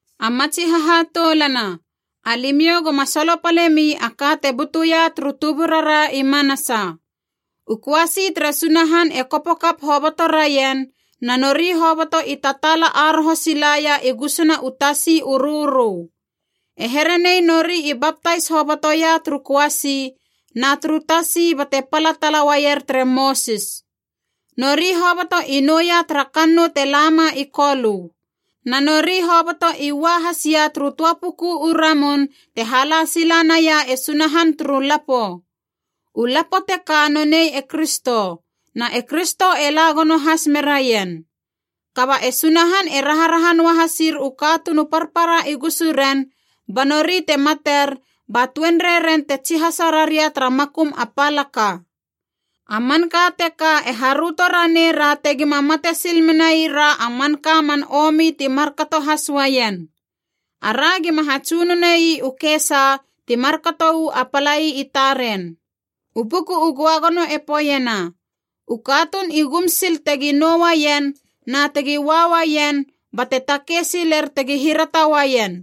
A matsi hahatoulana, alimiou goma solopalemi a ka te butuia turu tuburara i manasa. U köasi tere Sunahan e kopo kap hoboto raien, na nori hoboto i tataala aroho silaia i gusuna u Tasi u Rörö. E here nei nori i baptais hobotoia turu köasi na turu tasi bate pala tala uaier tere Mosis. Nori hoboto i nouia tara kannou te lama i Kolö. Na nori hoboto i ua hasia turu töa puku u ramun te hala sila naia e Sunahan turu lapo. U lapo teka nonei e Kristo, na e Kristo e la gono has meraien. Kaba e Sunahan e raharaha noa hasir u katuun u parpara i gusuren, ba nori te mater ba tuenrei ren e tsihasa raria tara makum a palaka. A manka teka e haröto ranei ra tegima mate sil menai ra a manka man omi ti markato has uaien. Ara gima hatsunone ii u kesa ti markato uu a palai i taren. U Buku u Göagono e poeiena, “U katuun i gum sil tegi nou uaien na tegi ua uaien bate takei siler tegi hirata uaien.”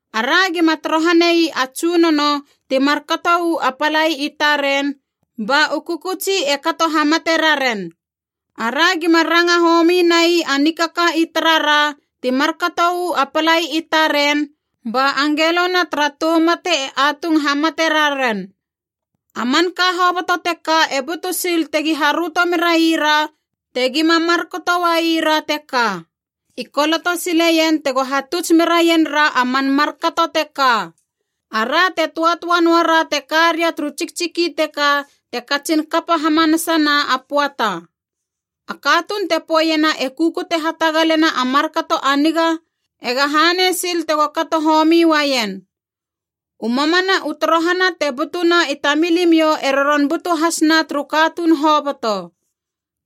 Ara gima torohane ii a Tsunono ti markato uu a palai i taren ba u kökötsi e kato hamate raren. Ara gima ranga homi nai a nikaka i tarara ti markato uu a palai i taren ba angelona tara tou mate e atung hamate raren. A manka hoboto teka e butu sil tegi haröto meraira tegima markato uaira teka. I koloto sileien tego hatuts meraien ra a man markato teka, ara te töatöa noara te ka ria turu tsiktsiki teka te katsin kapa hamanasana a pöata. A katuun te poeiena e kukute hatagalena a markato a niga ega hanei sil tego kato homi uaien. U mamana u torohana te butuna i tamilimiou e roron butu hasna turu katuun hoboto.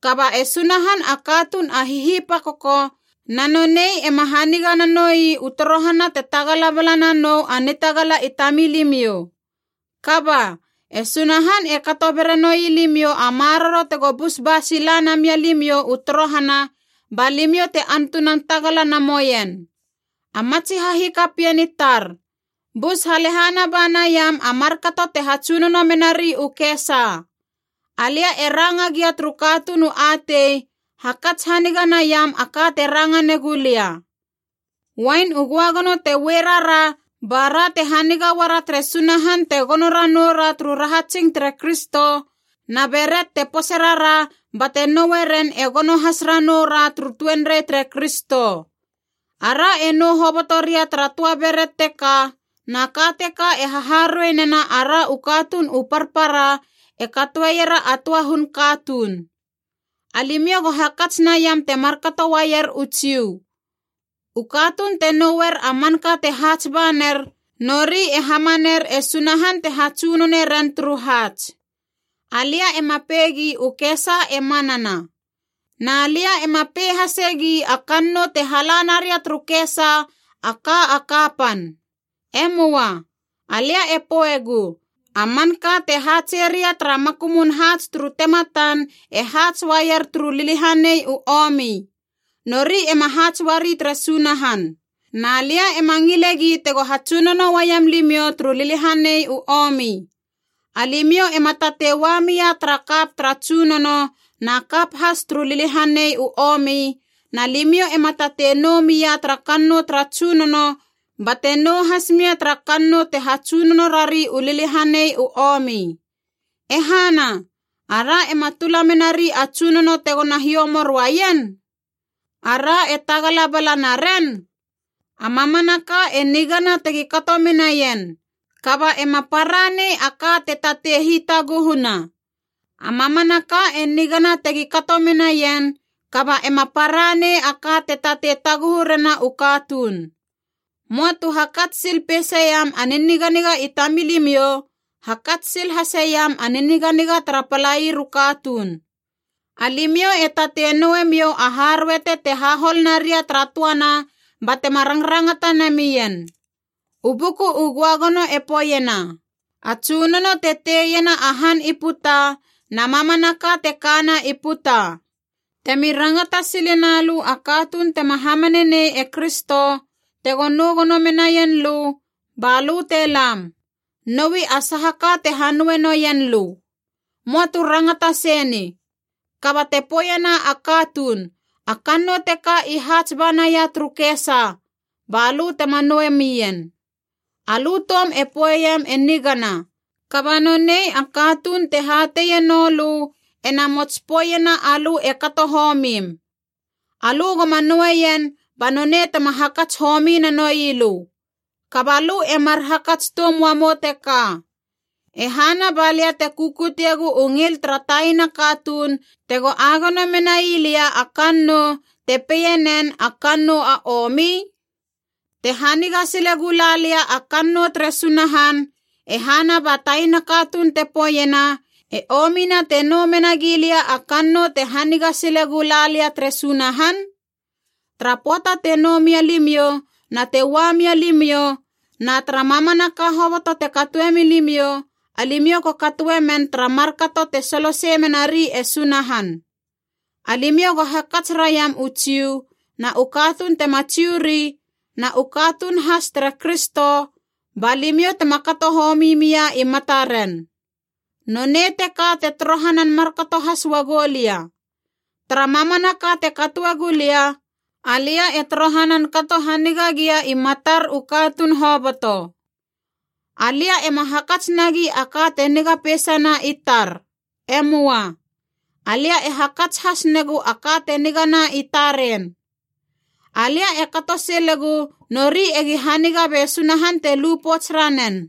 Kaba e Sunahan a katuun a hihipakoko na nonei ema haniga na noi u torohana te tagala bala na nou a nitagala i tamilimiou. Kaba, e Sunahan e kato bera noi limiou a maroro tego bus ba sila na milimiou u torohana ba limiou te antunan tagala na moien. A matsi hahikapien i tar, bus halehana ba naiam a markato te hatsunono menari u kesa. Alia e ranga gia turu katuun u atei, hakats haniga naiam a ka te ranga negu lia. Uain u göagono te ue rara bara te haniga uara tere Sunahan te gono ranou ra turu rahatsing tere Kristo, na beret te pose rara bate noe ren e gono has ranou ra turu tuenrei tere Kristo. Ara e nou hoboto ria tara töa beret teka, na ka teka e haharuei nena ara u katuun u parpara e katoeiera a töa hun katuun. Alimiou go hakats naiam te markato uaier u Jiu. U katuun te nouer a manka te haats ba ner, nori e hamaner e Sunahan te hatsunone ren turu haats. Alia ema peigi u kesa e manana. Na lia ema pei hasegi a kannou te hala naria turu kesa a ka a kapan. E möa! Alia e poegu a manka te haatse ria tara makumun haats turu tematan e haats uaier turu liliahanei u omi. Nori ema haats uari tere Sunahan. Na lia ema ngilegi tego hatsunono uaiam limiou turu liliahanei u omi. Alimiou ema tatei ua mia tara kap tara Tsunono na kap has turu liliahanei u omi, na limiou ema tatei nou mia tara kannou tara Tsunono bate nou has mia tara kannou te hatsunono rari u liliahanei u omi. E hana! Ara ema tula menari a Tsunono tegona hiomor uaien? Ara e tagala bala naren? “A mamanaka e nigana tegi kato menaien,” kaba ema para nei a ka te tatei hitaguhuna. “A mamanaka e nigana tegi kato menaien,” kaba ema para nei a ka te tatei taguhu rena u katuun. Möa tu hakats sil peiseiam a niniganiga i tamilimiou, hakats sil haseiam a niniganiga tara palair u katuun. Alimiou e tatei nouemiou a haruete te hahol naria tara töana batema rangrangata namien. U Buku u Göagono e poeiena, “A Tsunono te teiena a han i puta na mamanaka te kana i puta.” Temi rangata sile na lö a katuun tema hamane nei e Kristo tegona nou gono menaien lö balö te lam, noui a saha ka te hanoue neien lö. Möa tu rangata sei ni. Kaba te poeiena a katuun, “A kannou teka i haats ba naia turu kesa,” ba lö tema noue mien. Alö toum e poeiem e nigana, kaba nonei a katuun te hateienou lö ena namots poeiena alö e kato homim. Alö goma noueien ba nonei tema hakats homi nanoi lö. Kaba lö e mar hakats toum uamou teka, “E hana balia te kukutegou u ngil tara taina katuun tego agono menai lia a kannou, te peinen, a kannou a omi?” Te haniga sile gula lia a kannou tere Sunahan, e hana ba taina katuun te poeiena, e omina te nou mena gilia a kannou te haniga sile gula lia tere Sunahan? Tara pöata te nou mia limiou na te ua mia limiou, na tara mamanaka hoboto te katoe milimiou, alimiou go katoe men tara markato te solosei menari e Sunahan. Alimiou go hakats raiam u Jiu na u katuun tema Jiu ri na u katuun has tere Kristo, ba limiou tema kato homi mia i mataren. Nonei teka te torohanan markato has uagou lia. Tara mamanaka te katoe gulia, alia e torohanan kato haniga gia i matar u katuun hoboto. Alia ema hakats nagi a ka te niga peisana i tar. E möa. Alia e hakats has negu a ka te nigana i taren. Alia e kato silegu nori egi haniga be Sunahan te lu pouts ranen.